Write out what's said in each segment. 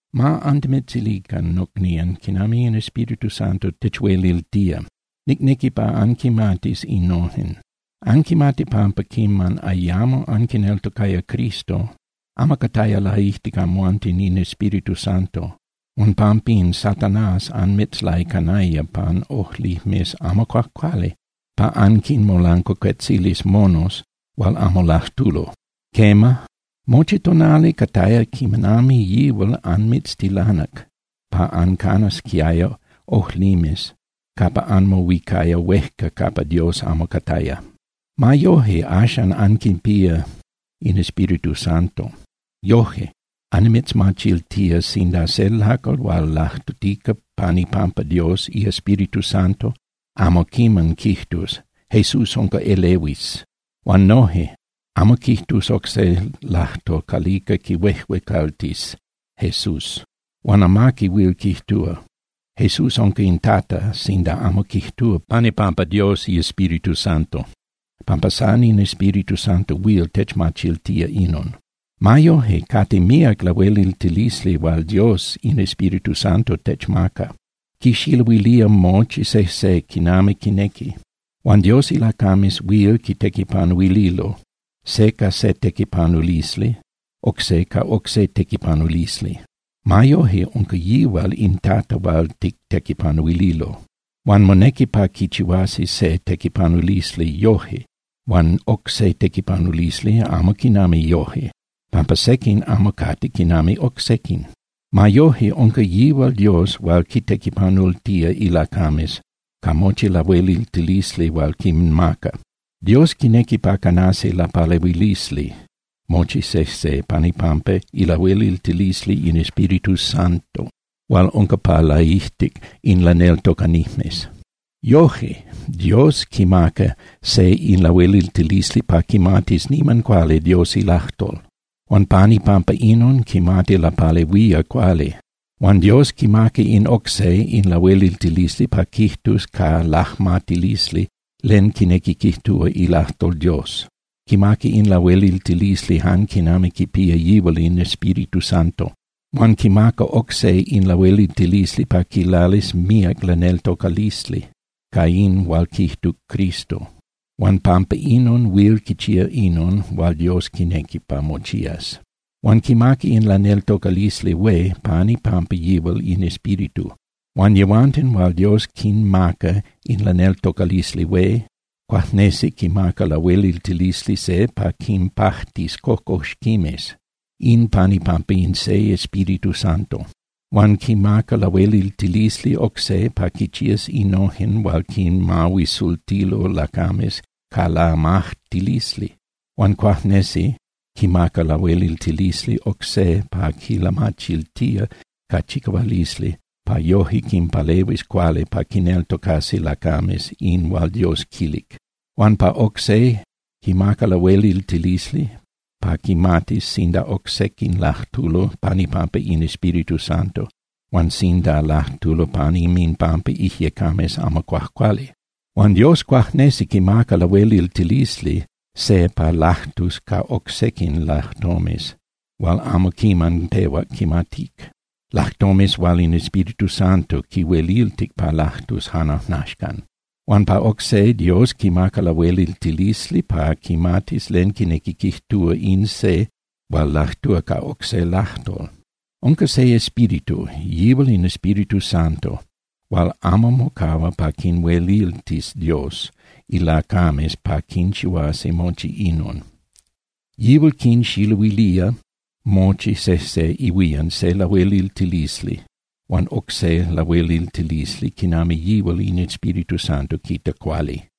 Ma antimitzilican, nocnían, quinami in Espíritu Santo techueliltía, nicnequi pa anquimatis innojen. Anquimati pampa quiman ayamo anquineltocaya Cristo, amo cataya laijtic amhuanten in Espíritu Santo huan pampín, Satanás anmitzlaicanaya pan ojlimes amo cuajcuali pa anquinmolancuacuetzilis monos hual amo lajtulo. Quema, mochi tonali cataya quinami yihual anmitztilanac pa ancanasquiaya ojlimes capa anmohuicaya huejca capa Dios amo cataya. Ma yoje, axan anquipía in Espíritu Santo. Yoje, annimitzmachiltía sinda se lacal hual lajtutica pan ipampa Dios iEspíritu Santo amo quiman quijtus: “¡Jesús unca elehuis!” Huan noje amo quijtus oc se lajtol calica quihuejuecaltis Jesús. Huan amaqui huil quijtúa: “¡Jesús unca in Tata!” sinda amo quijtúa pan ipampa Dios iEspíritu Santo, pampa san in Espíritu Santo huil techmachiltía inon. Ma yoje, cate míac lahueliltilisli hual Dios in Espíritu Santo techmaca, quixiluilía mochi sejse quinami quinequi. Huan Dios ilacames huil quitequipanuililo, se ca se tequipanulisli, oc se ca oc se tequipanulisli. Ma yoje unca yihual in Tata hual tictequipanuililo. Huan monequi pa quichihuasi se tequipanulisli yoje huan oc se tequipanulisli amo quinami yoje, pampa sequin amo cate quinami oc sequin. Ma yoje, unca yihual Dios hual quintequipanultía ilacames ca mochi lahueliltilisli hual quinmaca. Dios quinequi pa canasi lapalehuilisli mochi sejse pan ipampa ilahueliltilisli in Espíritu Santo hual unca pa laijtic in laneltocanijmes. Yoje, Dios quimaca se in lahueliltilisli pa quimatis niman cuali Dios ilajtol. Huan pan ipampa inon, quimati lapalehuía cuali. Huan Dios quimaca in oc se in lahueliltilisli pa quijtus ca lajmatilisli len quinequi quijtúa ilajtol Dios, quimaca in lahueliltilisli jan quinami quipía yihual in Espíritu Santo. Huan quimaca oc se in lahueliltilisli pa quilalis míac laneltocalisli ca in hual quijtuc Cristo, huan pampa inon huil quichía inon hual Dios quinequi pa mochías. Huan quimaca in laneltocalisli hué pan ipampa yihual in Espíritu. Huan yehuanten hual Dios quinmaca in laneltocalisli hué, cuajnesi quimaca lahueliltilisli se pa quinpajtis cocoxquimes, in pan ipampa in se Espíritu Santo. Huan quimaca lahueliltilisli oc se pa quinchías innojen hual quinmahuisultilo lacames ca lamajtilisli, huan cuajnesi quimaca lahueliltilisli oc se pa quilamachiltía ca chicahualisli pa yoje quinpalehuis cuali pa quineltocasi lacames in hual Dios quilic. Huan pa oc se quimaca lahueliltilisli pa quimatis sinda oc sequin lajtulo pan ipampa in Espíritu Santo huan sinda lajtulo pan inminpampa ijyecames amo cuajcuali. Huan Dios cuajnesi quimaca lahueliltilisli se pa lajtus ca oc sequin lajtomes hual amo quiman pehuac quimatic, lajtomes hual in Espíritu Santo quihueliltic pa lajtus jan ajnaxcan. Huan pa oc se Dios quimaca lahueliltilisli pa quimatis len quinequi quijtúa in se hual lajtúa ca oc se lajtol. Unca se Espíritu, yihual in Espíritu Santo hual amo mocahua pa quinhueliltis Dios ilacames pa quinchihuasi mochi inon. Yihual quinxiluilía mochi sejse ihuían se lahueliltilisli huan oc se lahueliltilisli quinami yihual in Espíritu Santo quita cuali.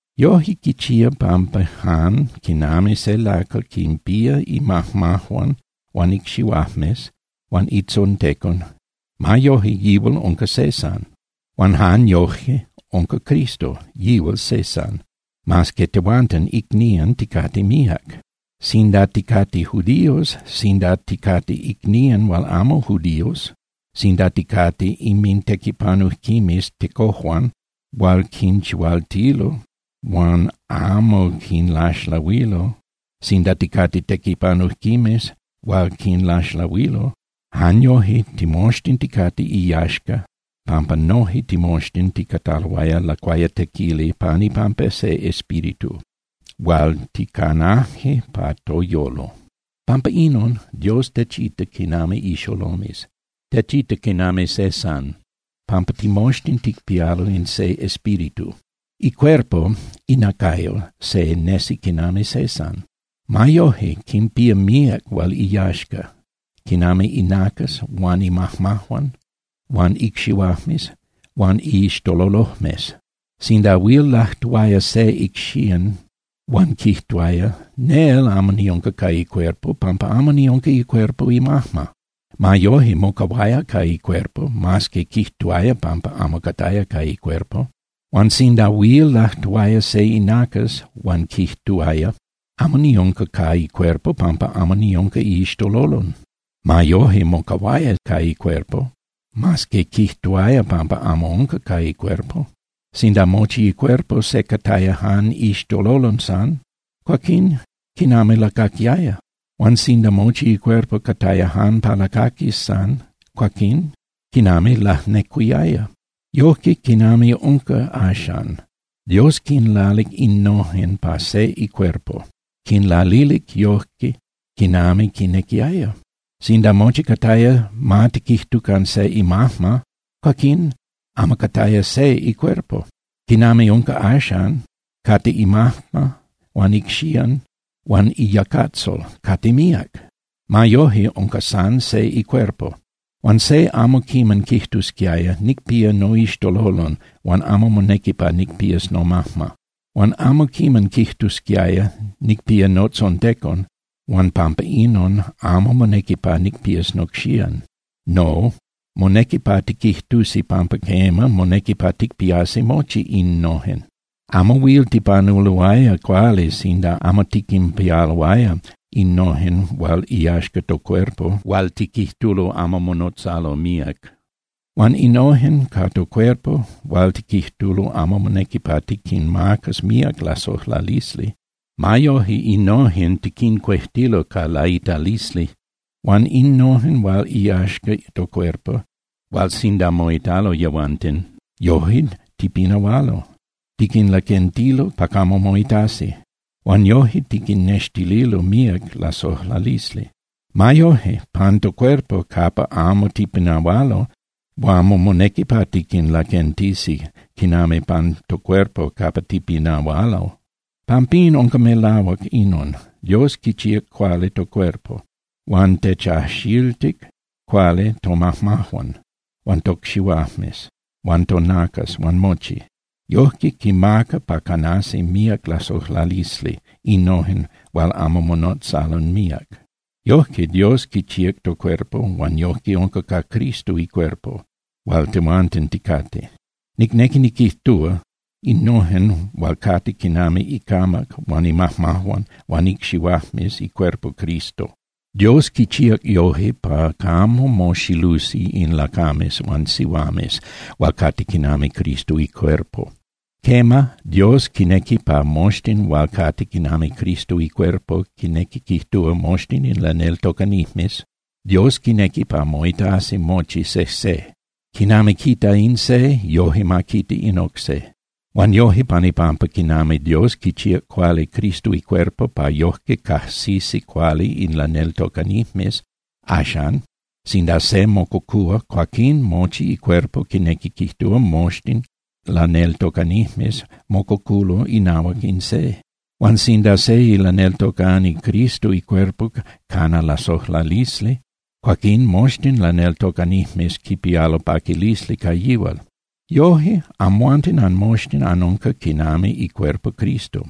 Yoje quichía pampa jan quinami se lacal quinpía imajmajuan huan icxihuajmes huan itzontecon, ma yoje, yihual unca se san. Huan jan yoje unca Cristo, yihual se san, mas que tehuanten icnían ticate míac. Sinda ticate judíos, sinda ticate icnían hual amo judíos, sinda ticate inmintequipanujquimes tecojuan hual quinchihualtilo huan amo quinlaxlahuilo, sinda ticate tequipanujquimes hual quinlaxlahuilo, jan yoje timoxtin ticate iyaxca pampa noje timoxtin ticataloaya lacuayatequili pan ipampa se Espíritu hual ticanaje pa toyolo. Pampa inon, Dios techita quinami ixolomes, techita quinami se san pampa timoxtin ticpialo in se Espíritu. Icuerpo (inacayo) se nesi quinami se san. Ma yoje quinpía míac hual iyaxca, quinami inacas huan imajmajuan huan icxihuajmes huan iixtololojmes. Sinda huil lajtuaya se icxían huan quijtuaya: “Nel amo niunca ca icuerpo pampa amo niunca icuerpo imajma”, ma yoje mocahuaya ca icuerpo mas que quijtuaya pampa amo cataya ca icuerpo. Huan sinda huil lajtuaya se inacas huan quijtuaya: “Amo niunca ca icuerpo pampa amo niunca iixtololon”, ma yoje, mocahuaya ca icuerpo mas que quijtuaya pampa amo unca ca icuerpo. Sinda mochi icuerpo se cataya jan iixtololon san, cuaquín ¿quinami lacaquiaya? Huan sinda mochi icuerpo cataya jan pa lacaquis san, cuaquín ¿quinami lajnecuiaya? Yojque, quinami unca axan, Dios quinlalic innojen pa se icuerpo, quinlalilic yoje quinami quinequiaya. Sinda mochi cataya ma tiquijtucan se imajma, cuaquín amo cataya se icuerpo. Quinami unca axan, cate imajma huan icxían huan iyacatzol, cate míac. Ma yoje, unca san se icuerpo. Huan se amo quiman quijtusquiaya: “Nicpía noixtololon huan amo monequi pa nicpías nomajma.” Huan amo quiman quijtusquiaya: “Nicpía notzontecon huan pampa inon amo monequi pa nicpías nocxían.” No, monequi pa tiquijtusi pampa quema, monequi pa ticpiasi mochi innojen. Amo huil tipanuloaya cuali sinda amo tiquinpialoaya innojen hual iyaxca tocuerpo hual tiquijtulo amo monotzalo míac. Huan innojen ca tocuerpo hual tiquijtulo amo monequi pa tiquinmacas míac lasojlalisli, ma yoje innojen tiquincuejtilo ca laitalisli. Huan innojen hual iyaxca tocuerpo hual sinda moitalo yehuanten, yoje tipinahualo, tiquinlaquentilo pa camo moitasi huan yoje tiquinnextililo míac lasojlalisli. Ma yoje, pan tocuerpo capa amo tipinahualo, amo monequi pa tiquinlaquentisi quinami pan tocuerpo capa tipinahualo. Pampín, unca melahuac inon: Dios quichíac cuali tocuerpo huan techajxiltic cuali tomajmajuan huan tocxihuajmes huan tonacas huan mochi. Yojque quimaca pa canasi míac lasojlalisli innojen hual amo monotzalo míac. Yojque Dios quichíac tocuerpo huan yojque unca ca Cristo icuerpo hual tehuanten ticate, nicnequi niquijtúa innojen hual cate quinami icamac huan imajmajuan huan icxihuajmes icuerpo Cristo. Dios quichíac yoje pa camo moxilusi in lacames huan sihuames hual cate quinami Cristo icuerpo. Quema, Dios quinequi pa moxtin hual cate quinami Cristo icuerpo, quinequi quijtúa, moxtin in laneltocanijmes, Dios quinequi pa moitasi mochi sejse. Quinami quita in se, yoje ma quita in oc se. Huan yoje pan ipampa quinami Dios quichíac cuali Cristo icuerpo pa yojque cajsisi cuali in laneltocanijmes, axan, sinda se mococúa, cuaquín mochi icuerpo, quinequi quijtúa, moxtin laneltocanijmes, mococulo inahuac in se. Huan sinda se ilaneltocani Cristo icuerpo cana lasojlalisli, cuaquín moxtin laneltocanijmes quipialo paquilisli ca yihual. Yoje, amhuanten anmoxtin anunca quinami icuerpo Cristo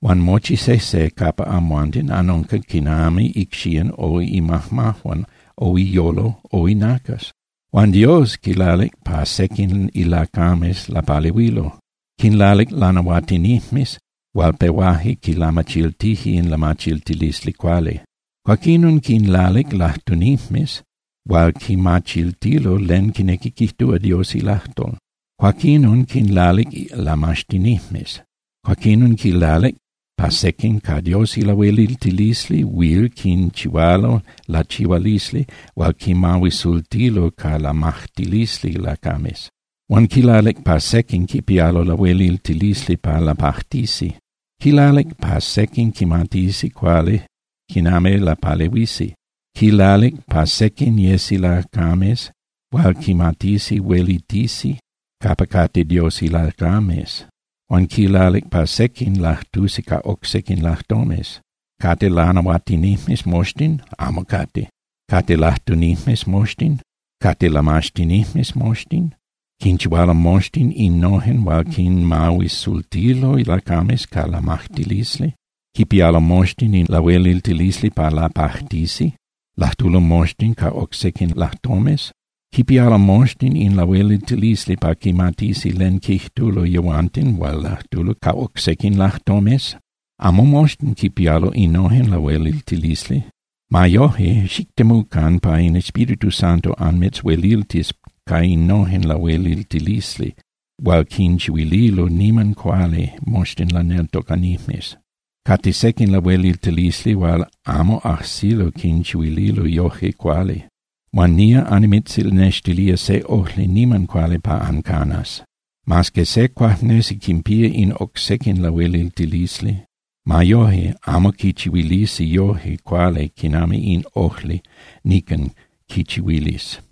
huan mochi sejse capa amhuanten anunca quinami icxían o imajmajuan o iyolo o inacas. Huan Dios quilalic pa sequin ilacames lapalehuilo. Quinlalic lanahuatinijmes hual pehuaje quilamachiltije in lamachiltilisli cuali. Cuaquinon quinlalic lajtunijmes hual quinmachiltilo len quinequi quijtúa Dios ilajtol. Cuaquinon quinlalic lamaxtinijmes. Cuaquinon quilalic pa sequin ca Dios ilahueliltilisli huil quinchihualo lachihualisli hual quinmahuisultilo ca lamajtilisli lacames. Huan quilalic pa sequin quipialo lahueliltilisli pa lapajtisi. Quilalic pa sequin quimatisi cuali quinami lapalehuisi, quilalic pa sequin yesi lacames hual quimatisi huelitisi capa cate Dios ilacames, huan quilalic pa sequin lajtusi ca oc sequin lajtomes. ¿Cate lanahuatinijmes moxtin? Amo cate. ¿Cate lajtunijmes moxtin? ¿Cate lamaxtinijmes moxtin? ¿Quinchihualo moxtin innojen hual quinmahuisultilo lacames ca lamajtilisli? ¿Quipialo moxtin in lahueliltilisli pa lapajtisi? ¿Lajtulo moxtin ca oc sequin lajtomes? ¿Quipialo moxtin in lahueliltilisli pa quimatisi len quijtulo yehuanten hual lajtulo ca oc sequin lajtomes? Amo moxtin quinpialo innojen lahueliltilisli. Ma yoje, xictemucan pa in Espíritu Santo anmitzhueliltis ca innojen lahueliltilisli hual quinchihuililo niman cuali moxtin laneltocanijmes. Cate sequin lahueliltilisli hual amo ajsilo quinchihuililo yoje cuali. Huan nía annimitznextilía se ojli niman cuali pa ancanas. Mas que se cuajnesi quinpía in oc sequin lahueliltilisli, ma yoje amo quichihuilisi yoje cuali quinami in ojli nican quichihuilis.